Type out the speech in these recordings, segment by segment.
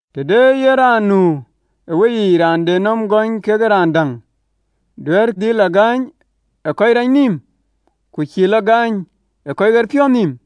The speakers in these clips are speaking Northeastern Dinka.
Të de yen raan nu ë weyiic raan de nɔm gööny kekë raan däŋ, duëër dhil tɔ gööny ë kɔc rac nïïm, ku cïï lɔ gööny ë kɔc ɣerpiɔ̈ɔ̈th nïïm?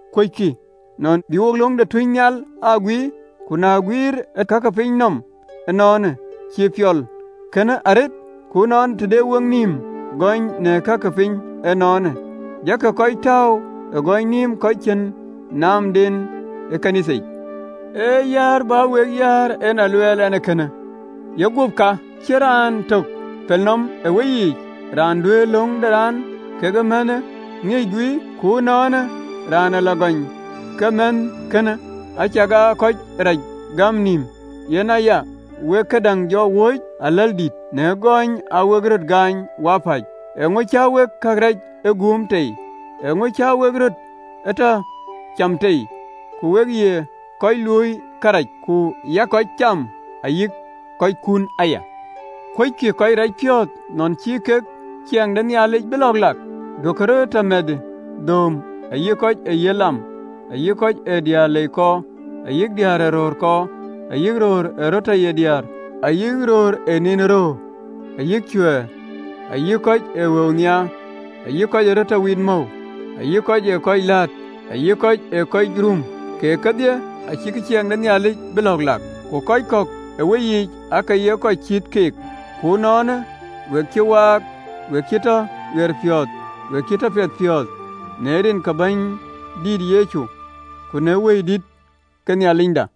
Kuöckï nɔn bï wo löŋ de tuucnhial aa guiir? Ku na guiëër ë ka ke pinyë nɔm ënɔɔnë, cïï piɔl ee kënë arëët? Ku ënɔɔnë, të dɛ wek nïïm gööny në ka ke pinyë ënɔɔnë, jakï kɔc tääu ë gööny nïïm kɔc cïn naamden ë ɣön ë Nhialic yic. Ee yäär bä wek yäär, en a luɛɛl ɛn ee kënë. Ye guöp ka, cïn raan töŋ pelnɔm ë weyiic, raan duëër löŋ de raan kekë mɛnhkënë ŋiëc guiir? Ku ënɔɔnë, raan ee lɔ gööny ke mɛnhkënë, acakaa ë kɔc reec gäm nïïm. Yen aya wek këdäŋ jɔ wööc aläldïïtë, në gööny aa wek röt gaany wapäc. Eeŋö cä wek kërac ee guum tei? Eeŋö cä wek röt ee tɔ cam tei? Ku we ye kɔc luöi kërac, ku yak kɔc cam, ayï kɔckun aya. Kuöckï kɔc racpiɔ̈ɔ̈th nɔn cïï kek ciɛɛŋ de Nhialic bï lɔ̈ɔ̈k lak? Duökï röt ë tɔ mɛnhë: dhööm, ayï kɔc ee yiëth lam, ayï kɔc ee diëër lei kɔɔr, ayï diëër ee röör kɔɔr, ayï röör ee röt tɔ ye diäär, ayï röör ë niin ë röör, ayï cuɛ̈ɛ̈r, ayï kɔc ee wëu nhiaar, ayï kɔc ye mɔ̈u wit, ayï kɔc ë kɔc läät, ayï kɔc ë kɔc rum, keek kedhie, acïkï ciɛɛŋ de Nhialic bï lɔ̈ɔ̈k lak. Ku kɔc kɔ̈k ë weyiic aake ye kɔc cït keek: ku ënɔɔnë we cï waak, we cï tɔ ɣerpiɔ̈ɔ̈th, we cï tɔ piɛthpiɔ̈ɔ̈th në rin ke Bɛ̈nydït Yecu Kërtho, ku në Wëidït ke Nhialicda.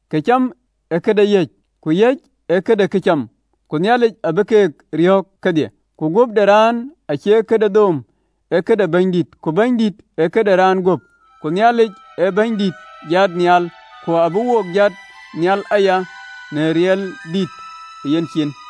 Këcam ee këde yäc, ku yäc ee këde këcam, ku abï Nhialic keek riɔ̈ɔ̈k kedhie. Ku guöp de raan acie këde dhööm, ee këde Bɛ̈nydït, ku Bɛ̈nydït ee këde raan guöp. Ku Nhialic ë Bɛ̈nydït jat nhial, ku abï wo jat nhial aya në riɛldïït ë yencin.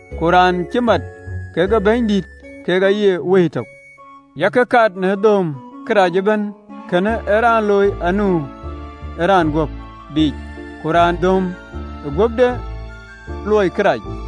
Ku raan cï mat kekë Bɛ̈nydït kek aye wëi tök. Yak kat në dhööm. Kërɛɛc ee raan looi anu ë raan guöp biic, ku raan dhööm ee guöpde luöi kërac.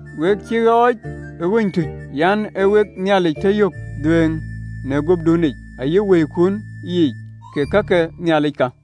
We cï ɣɔɔc ë ɣööc tuc: yen aa wek Nhialic tɔ yök dhuëëŋ në guöpdunic ayï wëikun yiic, kek ka ke Nhialic ka.